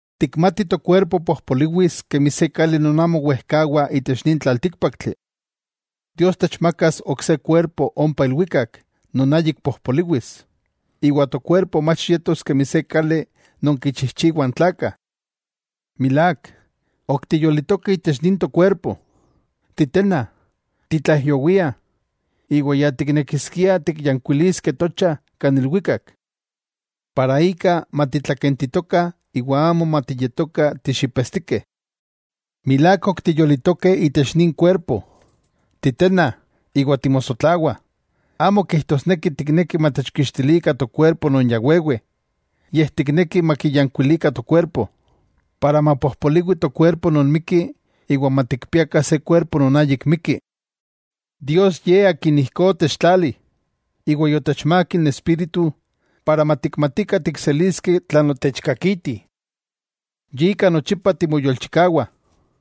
Tikmatih tokuerpo pojpoliwis kemi se kali non amo wejkawa itech nin tlaltíkpaktli. Dios techmakas ok se kuerpo ompa ilwikak non ayik pojpoliwis, iwa tokuerpo mach yetos kemi se kali non kichijchiwah n tlakah. Milák, ok tiyolitokeh itech nin tokuerpo titenna, titlaijyowiah, iwa ya tiknekiskiah tikyankuiliskeh tocha kan ilwikak, para ika matitlakentitokah iwa amo matiyetokah tixipetstikeh. Milák ok tiyolitokeh itech nin kuerpo, titenna iwa timosotlawah. Amo kijtosneki tiknekih matechkixtilikah tokuerpo non ya wewe, yej tiknekih makiyankuilikah tokuerpo, para mapojpoliwi tokuerpo non mikki iwa matikpiakah se kuerpo non ayik mikki. Dios Ye Akin ijkó otechtlali, iwa yotechmák n Espíritu para matikmatikah tikseliskeh tlan otechkakiti. Yika nochipa timoyolchikawah,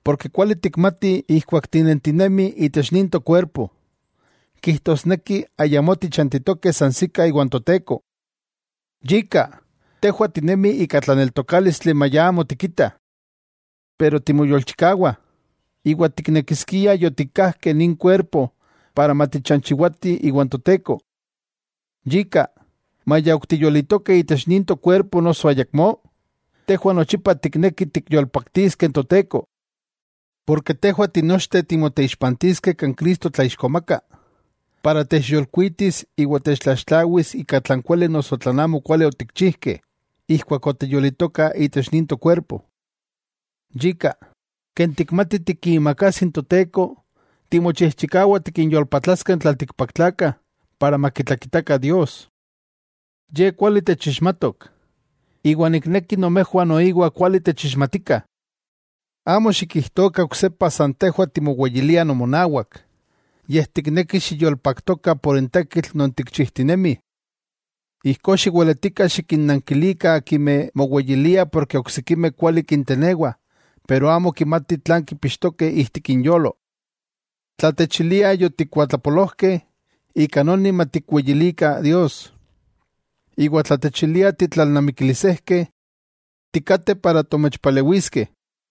porke kuali tikmatih ijkuak tinentinemih itech nin tokuerpo, kijtosneki ayamó tichantitokeh sansikah iwan Toteko. Yika, tejwah tinemih ika tlaneltokálistli maya amo tikitah. Pero timoyolchikawah, iwa tiknekiskiah yotikkajkeh nin kuerpo para matichanchiwatih iwan Toteko. Yika maya ok tiyolitokeh itech nin tokuerpo noso ayakmó, tejwah nochipa tiknekih tikyolpaktiskeh n Toteko. Porke tejwah tinochteh timoteixpantiskeh kan Cristo tlaixkomaka, para techyolkuitis iwa techtlaxtlawis ika tlan kuali noso tlan amokuali otikchijkeh, ijkuak otiyolitokah itech nin tokuerpo. Yika, ken tikmatih tikiimakajsi n Toteko, timochijchikawah tikinyolpatlaskeh n tlaltikpaktlakah para makitlakitakah Dios. Ye kuali techixmatok, iwa nikneki nomejwah noiwa kuali techixmatikah. Amo xikijtokah oksepa san tejwah timoweyiliah nomonawak, yej tiknekih xiyolopaktokah por n tekitl non tikchijtinemih. Ijkó xiweletikah xikinnankilikah akimeh moweyiliah porke oksikimeh kuali kintenewah pero amo kimatih tlan kipixtokeh ijtik inyolo. Tla techiliah yotikuatlapolojkeh, ika noni matikweyilikah Dios. Iwa tla techiliah titlalnamikilisejkeh, tikateh para tomechpalewiskeh.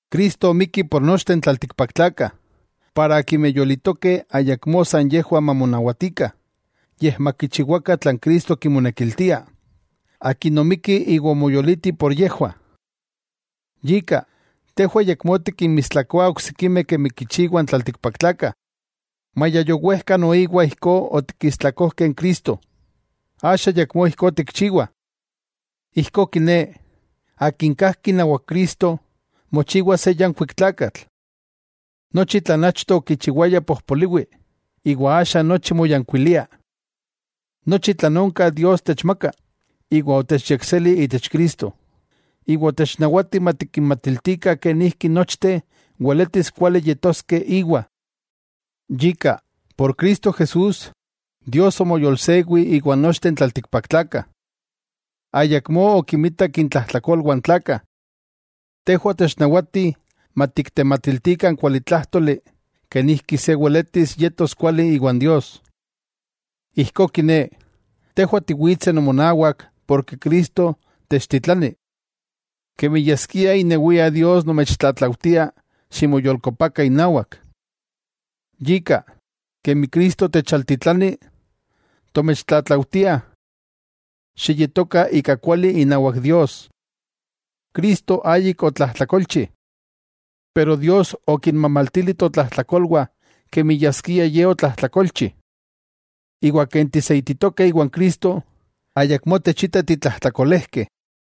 Cristo omikki por nochteh n tlaltikpaktlakah, para akimeh yolitokeh ayakmó san yejwah mamonawatikah, yej makichiwakah tlan Cristo kimonekiltia, Akin omikki iwa omoyoliti por yejwah. Yika, tejwah ayakmó tikinmistlakoah oksikimeh kemi kichiwah n tlaltikpaktlakah; maya yowejka noiwa ijkó otikistlakojkeh n Cristo, axa ayakmó ijkó tikchiwah. Ijkó kiné, akin kajki inawak Cristo, mochiwa se yankuik tlakatl. Nochi tlan achto okichiwaya pojpoliwi, iwa axa nochi moyankuilia. Nochi tlan onka Dios techmaka, iwa otechyekseli itech Cristo, iwa otechnawati matikinmatiltikah kenijki nochteh weletis kuali yetoskeh Íwa. Yika, por Cristo Jesús, Dios omoyolsewi iwan nochteh n tlaltikpaktlakah. Ayakmó okimitak intlajtlakolwah n tlakah. Tejwah otechnawatih matiktematiltikah n kualitlájtoli kenijki se weletis yetos kuali iwan Dios. Ijkó kiné, tejwah tiwitseh nomonawak porke Cristo techtitlani. Kemi yaskia inewia Dios nomechtlatlaujtia ximoyolkopakah inawak. Yika, kemi Cristo techaltitlani, tomechtlatlaujtiah: xiyetokah ika kuali inawak Dios. Cristo ayik otlajtlakolchi. Pero Dios okinmamaltili totlajtlakolwah kemi yaskia Ye otlajtlakolchi. Iwa ken tiseititokeh iwan Cristo, ayakmó techita titlajtlakolejkeh.